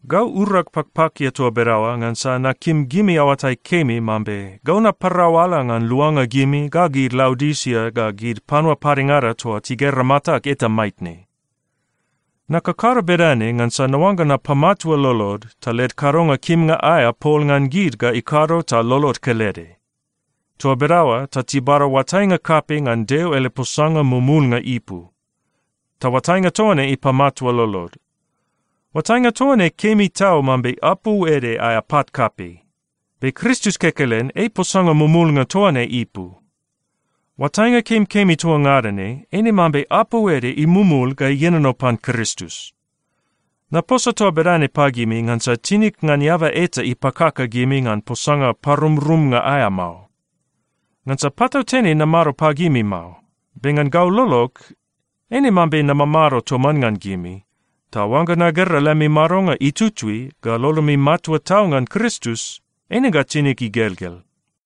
Gau urag pakpakia toa bedaoa ngansa nakim gimi aoatai kemi mambe gau naparau ala ngan luanga gimi ga gid Laodisia ga gid panua padengada toa tigera matag eta maitne. Nakakado bedane ngansa naoangga napamatua lolod, ta led kadonga kimnga aea pol ngan gid ga ikado ta lolod kelede. Toa bedaoa ta tibada oatainga kapei ngan Deo ele posanga mumulnga ipu, ta oatainga toa ne ipamatua lolod. Oatainga toa ne kemi tau mambe apou ede aea pat kapei. Be Kristus kekelen ei posanga mumulnga toa ne ipu. Oatainga kemikemi toa ngada ne eine mambe apou ede imumul ga ienono pan Kristus. Naposa toa bedane pagimi ngansa tinig ngan eaba eta ipakaka gimi ngan posanga parumrumnga aea mao. Ngansa patautene namado pagimi mao, be ngan gau lolog, eine mambe namamado toman ngan gimi. Ta oangga nagera lemi madonga itutui, ga lolomi matua tau ngan Kristus, eine ga tinig igelgel.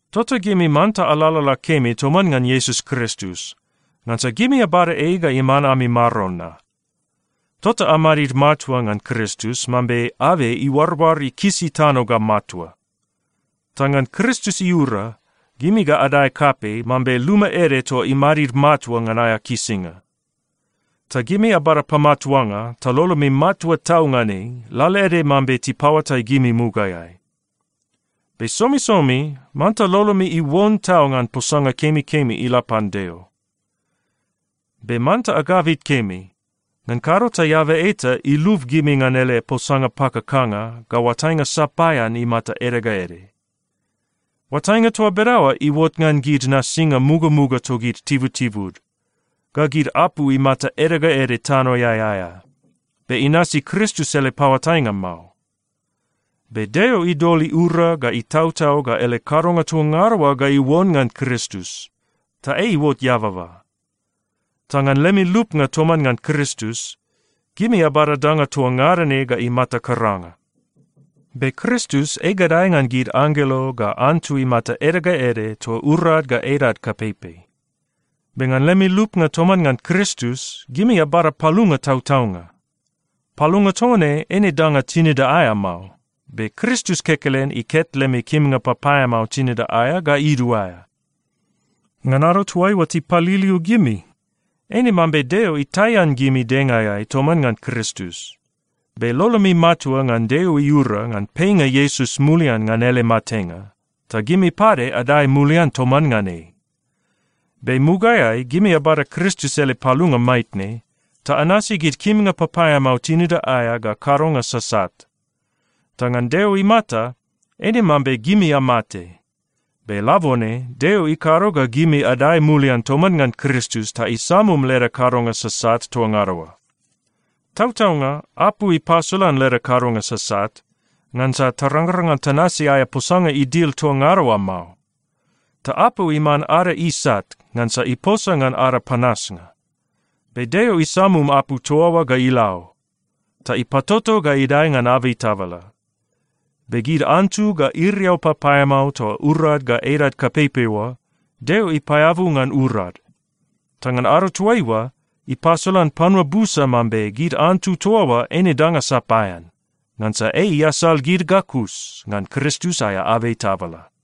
Tota gimi manta alalala kemi toman ngan Iesus Kristus, ngansa gimi abada ei ga iman ami Maron na. Tota amadid matua ngan Kristus mambe abei iuaroar ikisi tano ga matua. Ta ngan Kristus iura, gimi ga adae kapei, mambe luma ede toa imadid matua ngan aea kisinga. Ta gimi abada pamatuanga ta lolomi matua tau ngan ei, lalaede mambe tipaoatai gimi mugaeai. Be somisomi manta lolomi iuon tau ngan posanga kemikemi ila pan Deo. Be manta agabit kemi, ngan kado ta eaba eta ilub gimi ngan ele posanga pakakanga ga oatainga sapaean imata ede ga ede. Oatainga toa bedaoa iuot ngan gid nasinga mugamuga togid tibutibud, ga gid apu imata ede ga ede tanoeai aea, be inasi Kristus ele paoatainga mao. Be Deo idol iura ga itautau ga ele kadonga toa ngada oa ga iuon ngan Kristus, ta ei iuot eababa. Ta ngan lemi lupnga toman ngan Kristus, gimi abada danga toa ngada ne ga imata karanga. Be Kristus ei gadae ngan gid anggelo ga antu imata ede ga ede toa urad ga edad kapeipei. Be ngan lemi lupnga toman ngan Kristus, gimi abada palunga tautaunga. Palunga toa ne eine danga tinida aea mao, be Kristus kekelen iket lemi kimnga papaeamao tinida aea ga iduaea. Ngan ado toaiua tipaliliu gimi, eine mambe Deo itaian gimi dengaeai toman ngan Kristus. Be lolomi matua ngan Deo iura ngan peinga Iesus mulian ngan ele matenga, ta gimi pade adae mulian toman ngan ei. Be mugaeai, gimi abada Kristus ele palunga maitne, ta anasi gid kimnga papaeamao tinida aea ga kadonga sasat. Ta ngan Deo imata, eine mambe gimi amate. Be labone Deo ikado ga gimi adae mulian toman ngan Kristus ta isamum leda kadonga sasat toa ngada oa. Tautaunga, apu ipasolan leda kadonga sasat, ngansa tarangrang ngan tanasi aea posanga idil toa ngada oa mao. Ta apu iman ada isat ngansa iposa ngan ada panasnga. Be Deo isamum apu toa oa ga ila o. Ta ipatoto ga idae ngan abei tabala. Be gid antu ga iriau papaeamao toa urad ga edad kapeipei oa, Deo ipaeabu ngan urad. Ta ngan ado toaiua, ipasolan panua busa mambe gid antu toa oa eine danga sapaean, ngansa ei iasal gid ga kus ngan Kristus aea abei tabala.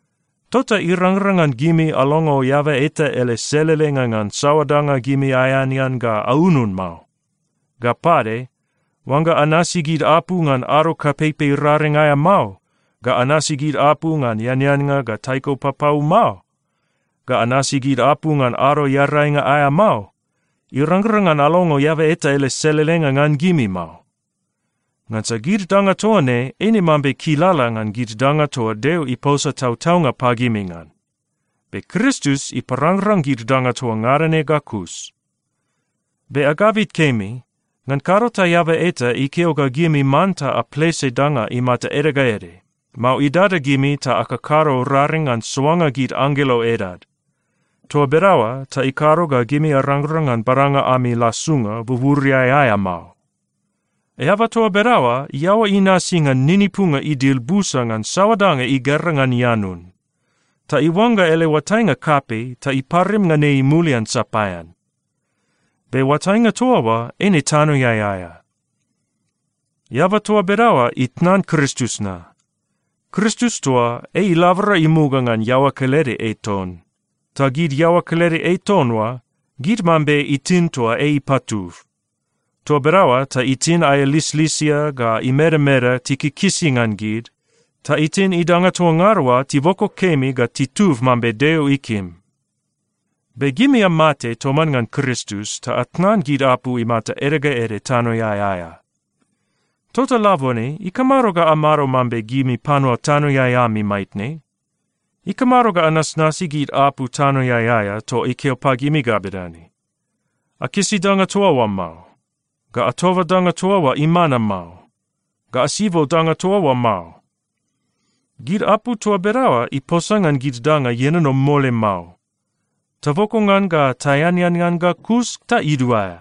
Tota irangrang ngan gimi alongo eaba eta ele selelenga ngan saoa danga gimi aeanean ga aunun mao. Ga pade, oangga anasi gid apu ngan ado kapeipei raring aea mao, ga anasi gid apu ngan eaneannga ngan taiko papau mao, ga anasi gid apu ngan Ado Earainga aea mao, irangrang ngan alongo eaba eta ele selelenga ngan gimi mao. Ngansa gid danga toa ne eine mambe kilala ngan gid danga toa Deo iposa tautaunga pagimi ngan, be Kristus iparangrang gid danga toa ngada ne ga kus. Be agabit kemi, ngan kado ta eaba eta ikeo ga gimi manta aplese danga imata ede ga ede, mao idada gimi ta akakado raring ngan soanga gid anggelo edad. Toa bedaoa ta ikado ga gimi arangrang ngan badanga ami lasunga buburiai aea mao. Eaba toa bedaoa iaoa inasi ngan ninipunga idil busa ngan saoa danga igera ngan ianun. Ta iuangga ele oatainga kapei ta iparim ngan ei mulian sapaean. Be oatainga toa oa eine tanoeai aea. Eaba toa bedaoa itnan Kristus na. Kristus toa, ei ilabora imuga ngan iaoa kelede ei ton, ta gid iaoa kelede ei ton oa, gid mambe itin toa ei ipatub. Toa bedaoa ta itin aea lislisia ga imedameda tikikisi ngan gid, ta itin idanga toa ngada oa tiboko kemi ga titub mambe Deo ikim. Be gimi amate toman ngan Kristus ta atnan gid apu imata ede ga ede tanoeai aea. Tota labone ikamado ga amado mambe gimi panua tanoeai ami maitne? Ikamado ga anasnasi gid apu tanoeai aea toa ikeo pagimi ga bedane, “Akisi danga toa oa mao! Ga atoba danga toa oa imana mao! Ga asibo danga toa oa mao!” Gid apu toa bedaoa iposa ngan gid danga ienono mole mao. Taboko ngan ga taeanean ngan ga kus ta iduaea.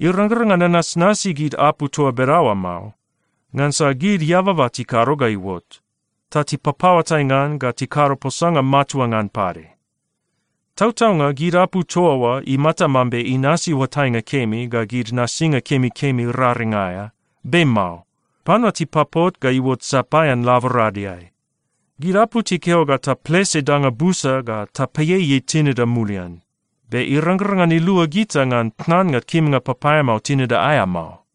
Irangrang ngan anasnasi gid apu toa bedaoa mao, ngansa gid eababa tikado ga iuot, ta tipapaoatai ngan ga tikado posanga matua ngan pade. Tautaunga, gid apu toa oa imata mambe inasi oatainga kemi ga gid nasinga kemikemi raring aea, be mao. Panua tipapot ga iuot sapaean laboradeai. Gid apu tikeo ga taplese danga busa ga tapaieiei tinida mulian, be irangrang ngan ilua gita ngan tnannga kimnga papaeamao tinida aea mao.